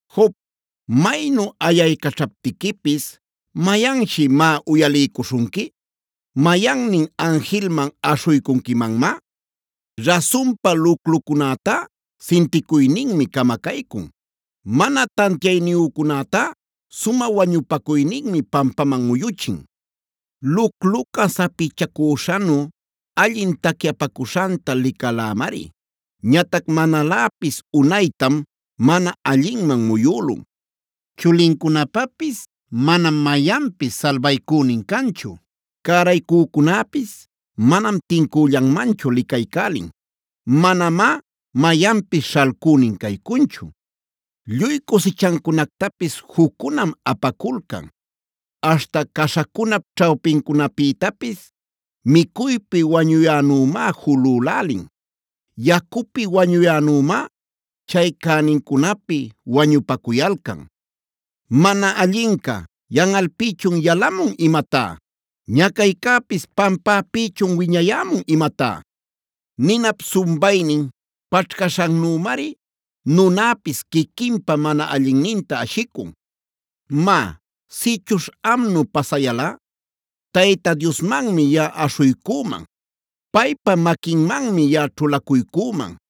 “Job, maynu ayaycaćhaptiquipis ¿mayanshi má uyaliycuśhunqui? ¿Mayannin anjilman aśhuycunquimanmá? Rasunpa, luclucunätá sinticuyninmi camacaycun. Mana tantiayniyücunätá sumä wañupacuyninmi pampaman muyuchin. Lucluca sapichacüśhanu allin tacyapacuśhanta licalämari. Ñatac manaläpis unaytam mana allinman muyülun. Chulincunapapis manam mayanpis salbaycünin canchu. Cäraycücunäpis manam tincüllanmanchu licaycälin. Manamá mayanpis śhalcünin caycunchu. Lluy cusichancunactapis juccunam apaculcan. Aśhta caśhacunap ćhawpincunapïtapis micuypi wañuyänümá julülälin. Yacupi wañuyänümá chay cänincunapi wañupacuyalcan. ¿Mana allinca yanꞌalpïchun yalamun imatá? ¿Ñacaycäpis pampäpïchun wiñayämun imatá? Ninap sumbaynin paćhcaśhannümari nunäpis quiquinpa mana allinninta ashicun. “Má, sïchuśh amnu pasayalꞌa Tayta Diosmanmi yaꞌa aśhuycüman, paypa maquinmanmi yaꞌa ćhulacuycüman.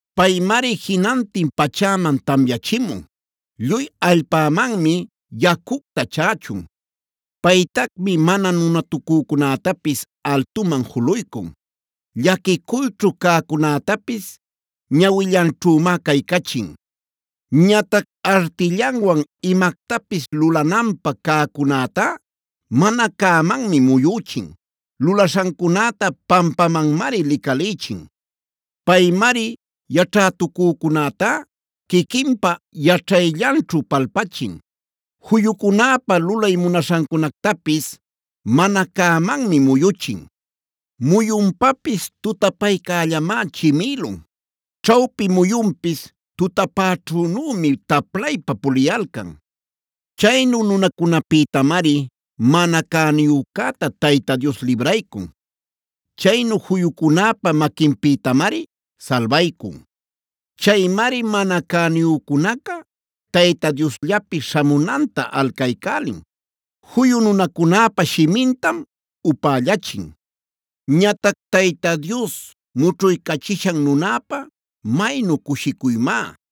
Paymari jinantin pachäman tamyachimun. Lluy allpämanmi yacucta chächun. Paytacmi mana nunatucücunätapis altuman juluycun. Llaquicuyćhu cäcunätapis ñawillanćhümá caycachin. Ñatac artillanwan imactapis lulananpä cäcunätá, mana cämanmi muyüchin. Lulaśhancunäta pampamanmari licalïchin. Paymari yaćhätucücunätá quiquinpa yaćhayllanćhu palpachin.b Juyucunäpa lulay munaśhancunactapis mana cämanmi muyuchin. Muyunpapis tutapaycällamá chimïlun. Ćhawpi muyunpis tutapäćhünümi taplaypa puliyalcan. Chaynu nunacunäpïtamari mana cäniyücäta Tayta Dios libraycun. Chaynu juyucunäpa maquinpïtamari salbaycun. Chaymari mana cäniyücunaca Tayta Diosllapi śhamunanta alcaycälin. Juyu nunacunäpa shimintam upällachin. “Ñatac Tayta Dios mućhuycachishan nunäpa maynu cushicuymá.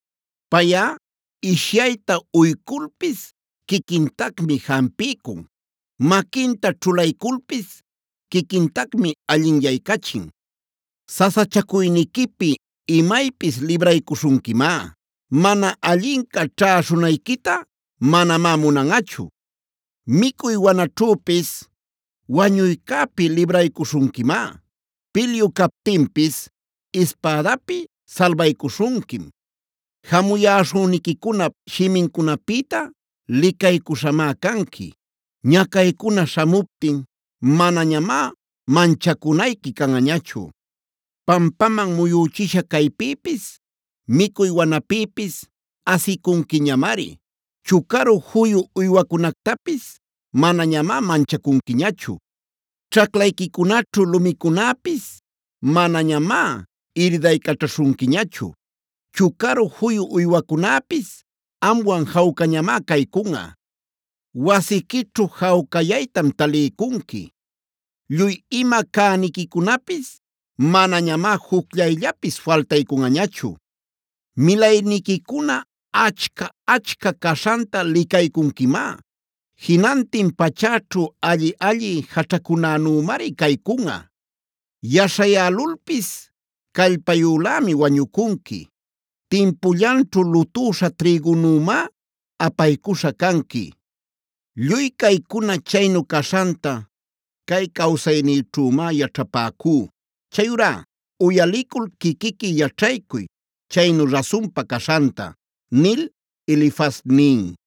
Payꞌa ishyayta uyculpis quiquintacmi jampiycun;d maquinta ćhulayculpis quiquintacmi allinyaycachin. Sasachacuyniquipi imaypis libraycuśhunquimá; mana allinca ćhäśhunayquita manamá munanꞌachu. Micuy wanaćhüpis wañuycäpi libraycuśhunquimá. Pilyu captinpis ispädapi salbaycuśhunquim. Jamuyaśhüniquicunap shimincunapïta licaycuśhamá canqui. Ñacaycuna śhamuptin manañamá manchacunayqui canꞌañachu. Pampaman muyüchisha caypïpis, micuy wanapïpis asicunquiñamari. Chucaru juyu uywacunactapis manañamá manchacunquiñachu. Ćhaclayquicunaćhu lumicunäpis manañamá iridaycaćhaśhunquiñachu. Chucaru juyu uywacunäpis amwan jawcañamá caycunꞌa. Wasiquićhu jawcayaytam taliycunqui. Lluy ima cäniquicunapis manañamá jucllayllapis faltaycunꞌañachu. Milayniquicuna achca-achca caśhanta licaycunquimá. Jinantin pachäćhu alli-alli jaćhacunänümari caycunꞌa. Yaśhayälulpis callpayülämi wañucunqui. Timpullanćhu lutüśha trïgunümá apaycuśha canqui. Lluy caycuna chaynu caśhanta cay cawsaynïćhümá yaćhapäcú. Chayurá uyalicul quiquiqui yaćhaycuy chaynu rasunpa caśhanta” nil Elifaz nin.